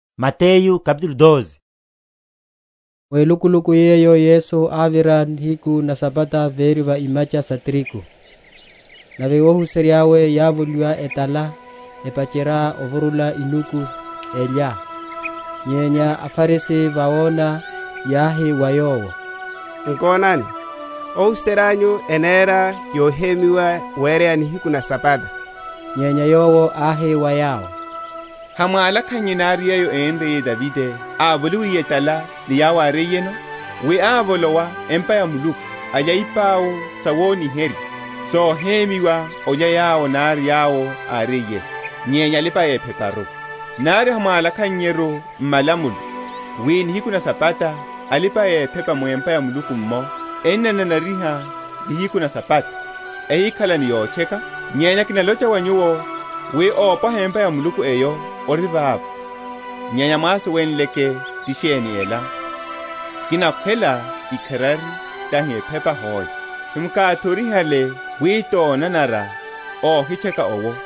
Yesu Apwiya a Sabata. Mu elukuluku yeyo Yesu ávira nihiku na Sabata véri va imacha sa tirigu; nave óhuserya’we yávoliwa etala, epacherya ovurula inuku, elya. Nyenya aFarisi, vawona, yáhi wa Yowo, Nkonani, óhuserya’nyu enera yohemyiwa wereya nihiku na Sabata. Nyenya Yowo áhi wa yawo, Hamwálakhannye nari yeyo énriye Davide, ávoliwiye etala, ni yawo áriyeno? wi ávolowa empa ya Muluku, alya ipau sawoniherya, sohemyiwa olya yowo nari yawo áriyeno, nyenya alipa‐epheparu. Nari hamwálakhannyeru m’malamulo, wi nihiku na Sabata, alipa‐ephepa mu empa ya Muluku’mmo ennananariha nihiku na Sabata, ehikhala ni yotcheka? Nyenya kinalocha wa nyuwo, wi ópwaha empa ya Muluku eyo ori vava. Nyenya mwásuwenleke ti sheni ela, Kinakhwela ikharari, tahi ephepa hoe, hemwakáthorihale wi tonanara óhitcheka’wo,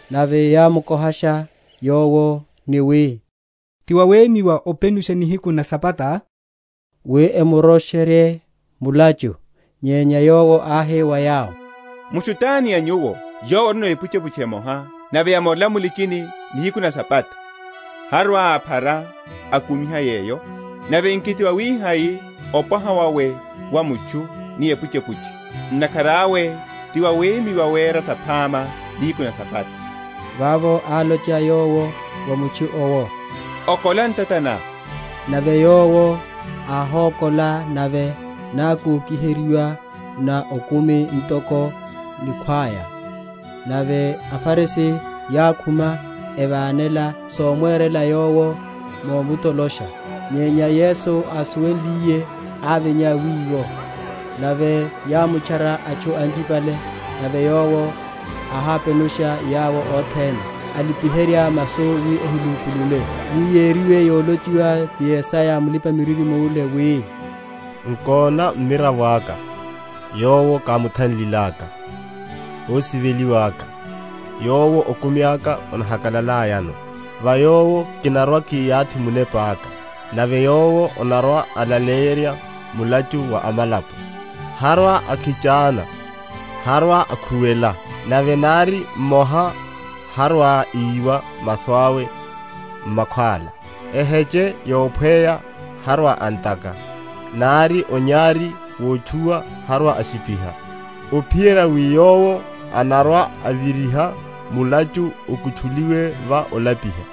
Nave yámukohasha Yowo, ni wi, Ti wawemyiwa openusha nihiku na Sabata? wi emurosh?-?erye mulachu. Nyenya Yowo áhi wa yawo, Mutchu tani a nyuwo, yowo orino epuchepuche emoha, nave yamorela mu’lichini nihiku na Sabata, harwa‐aphara, akumiha yeyo? Nave nki tiwawihai opwaha wawe wa mutchu ni epuchepuche! Ntakhara awe tiwawemyiwa wera saphama nihiku na Sabata. Vavo álocha Yowo wa mutchu’wo, Okola ntata ná. Nave yowo áhókola, nave nákokiheryiwa na okumi ntoko nikhwaya. Nave aFarisi yákhuma, evánela somwerela Yowo, mwomutolosha. Nyenya Yesu ásuwenliye, ávinya wiwo: nave yámutchara atchu anchipale; nave Yowo áhápenusha yawo othene, álipiherya masu wi ehimupulule: wi yériwe yolochiwa ti Yesaya mulipa‐miririmo’le, wi, Nkona mmiravo aka, yowo kúmuthanlilaka, Ósiveliwa’ka, yowo okumi aka onahakalalayano: Va Yowo kinarwa‐kiyathi Munepa’ka, Nave Yowo anarwa‐alaleyerya mulachu wa amalapo. Harwa‐akhichana, harwa‐akhuwela; Nave nari mmoha harwa‐iwa masu awe m’makhwála; Eheche yophweya harwa‐antaka, Nari onyari wotchuwa harwa‐ashipiha, Ophiyerya wi Yowo anarwa‐aviriha mulachu okutchuliwe va olapiha.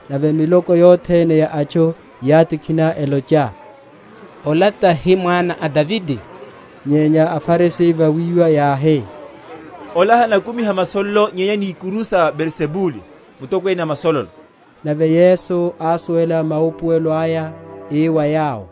Nave miloko yothene ya atchu yátikhina, elocha, Ola tahi mwana a Davide? Nyenya aFarisi vawiwa yáhi, Ola hanakumiha masololo nyenya ni ikuru sawe sa Beelzebule, mutokwene a masololo. Nave Yesu ásuwela maupuwela aya, ii wa yawo,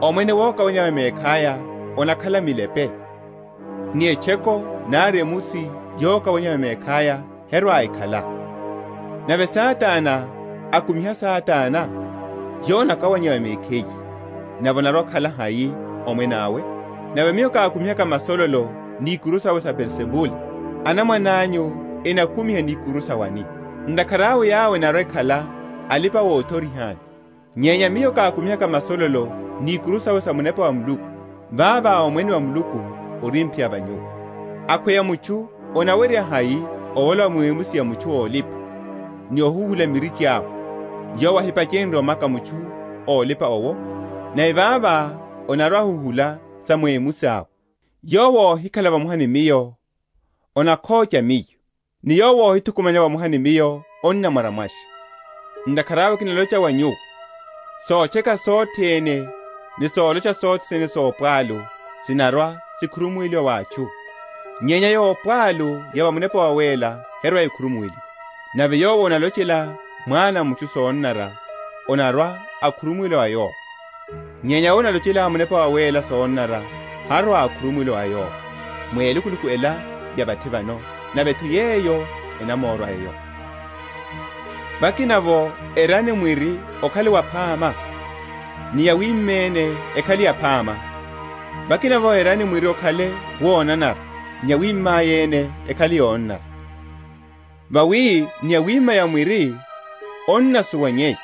Omwene wokawaneya va mekhaya onakhala milepe, ni etchoko nari emusi yokawaneya va mekhaya herwa‐ekhala: nave Satana akumiha Satana, yowo anaka?-?waneya va mekhiye: nave onarwa‐okhala hai omwene awe? Nave Miyo kákumihaka masololo ni ikuru sawe sa Beelzebule, anamwananyu enakumiha ni ikuru sa wani? ntakhara awe yawo enarwa‐ekhala alipa‐othoriha’nyu. Nyenya Miyo kákumihaka masololo ni ikuru sawe sa Munepa wa Muluku, vavo Omwene wa Muluku orimphiya va nyuwo. Akhweya mutchu anawerya hai ovolowa mu emusi ya mutchu ólipa, ni ohuhula mirichi awe, yowo áhipacherya omaka mutchu ólipa owo? nave vavo anarwa‐ahuhula sa mu emusi awe. Yowo óhikhala vamoha ni Miyo anakhocha Miyo, ni yowo óhithukumanya vamoha ni Miyo annamwaryamwasha. Ntakhara awe kinalocha wa nyuwo, Sotcheka sothene, ni solocha sothene sopwalu, sinarwa‐sikhurumuweliwa wa atchu; nyenya yopwalu ya va Munepa Wawéla herwa‐ekhurumuweliwa. Nave yowo analochela Mwana a mutchu sonanara, onarwa‐okhurumuweliwa wa yowo; nyenya yowo analochela Munepa Wawéla sonanara horwa‐okhurumuweliwa wa yowo, mu elukuluku ela ya vathi vano, nave’tho yeyo enamórwa eyo. Miri ni Sawima saya. Vakinavo erani mwiri okhale waphama, ni yawima’ya ene ekhale yaphama; vakinavo erani mwiri okhale wonanara; ni yawima’ya ene ekhale yonanara; vawi ni yawima’ya mwiri onnasuwanyeya.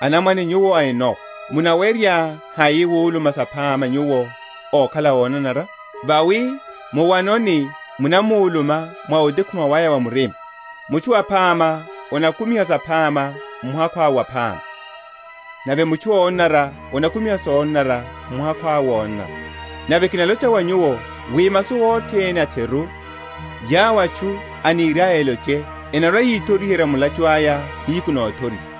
Anamwane nyuwo a enowa, munawerya hai wuluma saphama, nyuwo ókhala ónanara? vawi muwanoni munamuluma mwa otekhuma waya wa murima. Mutchu aphama anakumiha saphama m’muhakhu awe waphama, nave mutchu ónanara anakumiha sonanara m’muhakhu awe wonanara. Nave kinalocha wa nyuwo, wi masu othene a’theru, yawo atchu eniriaya eloche, enarwa‐yithoriherya mulachu aya nihiku nothoriha.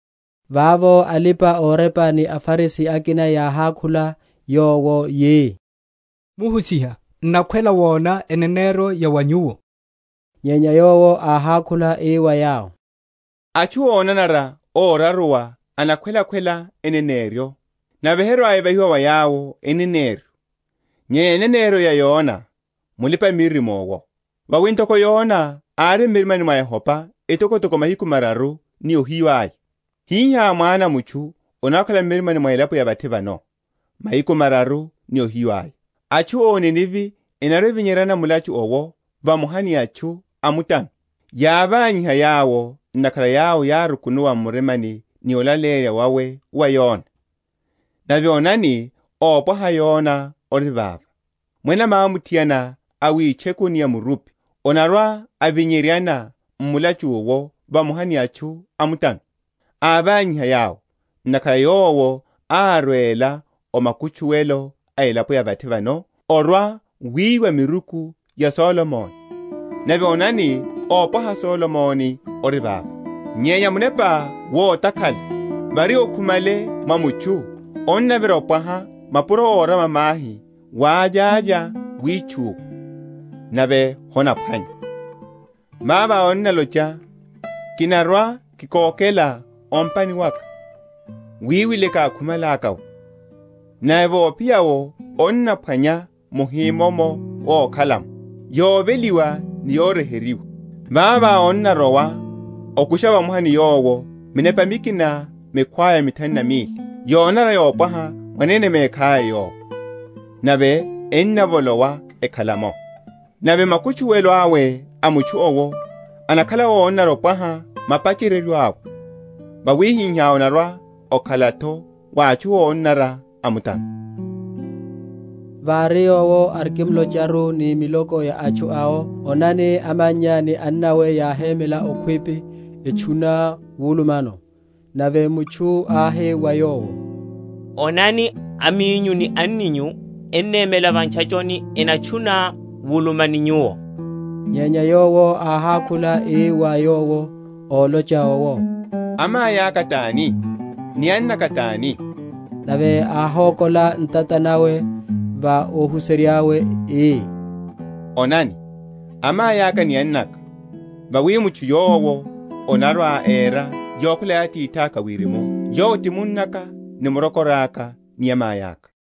Vavo alipa‐orepa ni aFarisi akina yáhákhula Yowo yi, Muhusiha, n’nakhwela wona eneneryo ya wa Nyuwo. Nyenya Yowo áhákhula ii wa yawo, Atchu ónanara óraruwa enakhwela‐khwela eneneryo; nave herwa‐evahiwa wa yawo eneneryo, nyenya eneneryo ya Yona mulipa‐miririmo’wo. Vawi ntoko Yona ári m’mirimani mwa chopa etokotoko mahiku mararu ni ohiyu aya, hihá Mwana a mutchu anarwa‐akhala m’murimani mwa elapo ya vathi vano, mahiku mararu ni ohiyu aya. Atchu a o Nineve enarwa‐evinyeryana m’mulachu’wo vamoha ni atchu a mutano, yávanyiha yawo; ntakhara yawo yárukunuwa m’murima ni olaleyerya wawe wa Yona; nave onani ópwaha Yona ori vava. Mwene mwamuthiana a witchekuni ya murupi anarwa‐avinyeryana m’mulachu’wo vamoha ni atchu a mutano, ávanyiha yawo: ntakhara yowo árwela o makutchuwelo a elapo ya vathi vano orwa‐wiwa miruku ya Solomoni; nave onani ópwaha Solomoni ori vava. Nyenya munepa wotakhala, vári okhumale mwa mutchu, onnavira opwaha mapuro órama mahi wavyavya witchuwa, nave honaphwanya. Vavo onnalocha, Kinarwa‐kikokela o’mpani waka, wiwile kákhumalaka’wo; nave vophiya’wo onaphwanya muhimomo ókhalamo, yoveliwa ni yoryeheryiwa. Vavo onnarowa, okusha vamoha ni yowo minepa mikina mikhwaya mithanu na mili, yonanara yopwaha mwanene mekhaya yowo, nave ennavolowa, ekhala’mo. Nave makutchuwelo awe a mutchu’wo enakhala ónanara opwaha mapacheryeryo awe. Wawihihá onarwa‐okhala’tho wa atchu ónanara a mutano. Annawe a Yesu. Vári Yowo arikimlocharu ni miloko ya atchu awo, onani, amannya ni annawe yáhémela okhwipi, etchuna wulumano. Nave mutchu áhi wa Yowo. Onani aminyu ni anninyu enemela va ntchachoni, enatchuna wuluma ni Nyuwo. Nyenya Yowo áhákhula, ii wa yowo ólocha owo, Amai aka tani? ni annaka tani? Nave áhókola ntata nawe va ohuserya’we, ii, Onani amai aka ni annaka! Vawi mutchu yowo anarwa‐era yokhwela ya Atithaka a Wirimu, yowo ti munnaka, ni murokoraka, ni amai aka.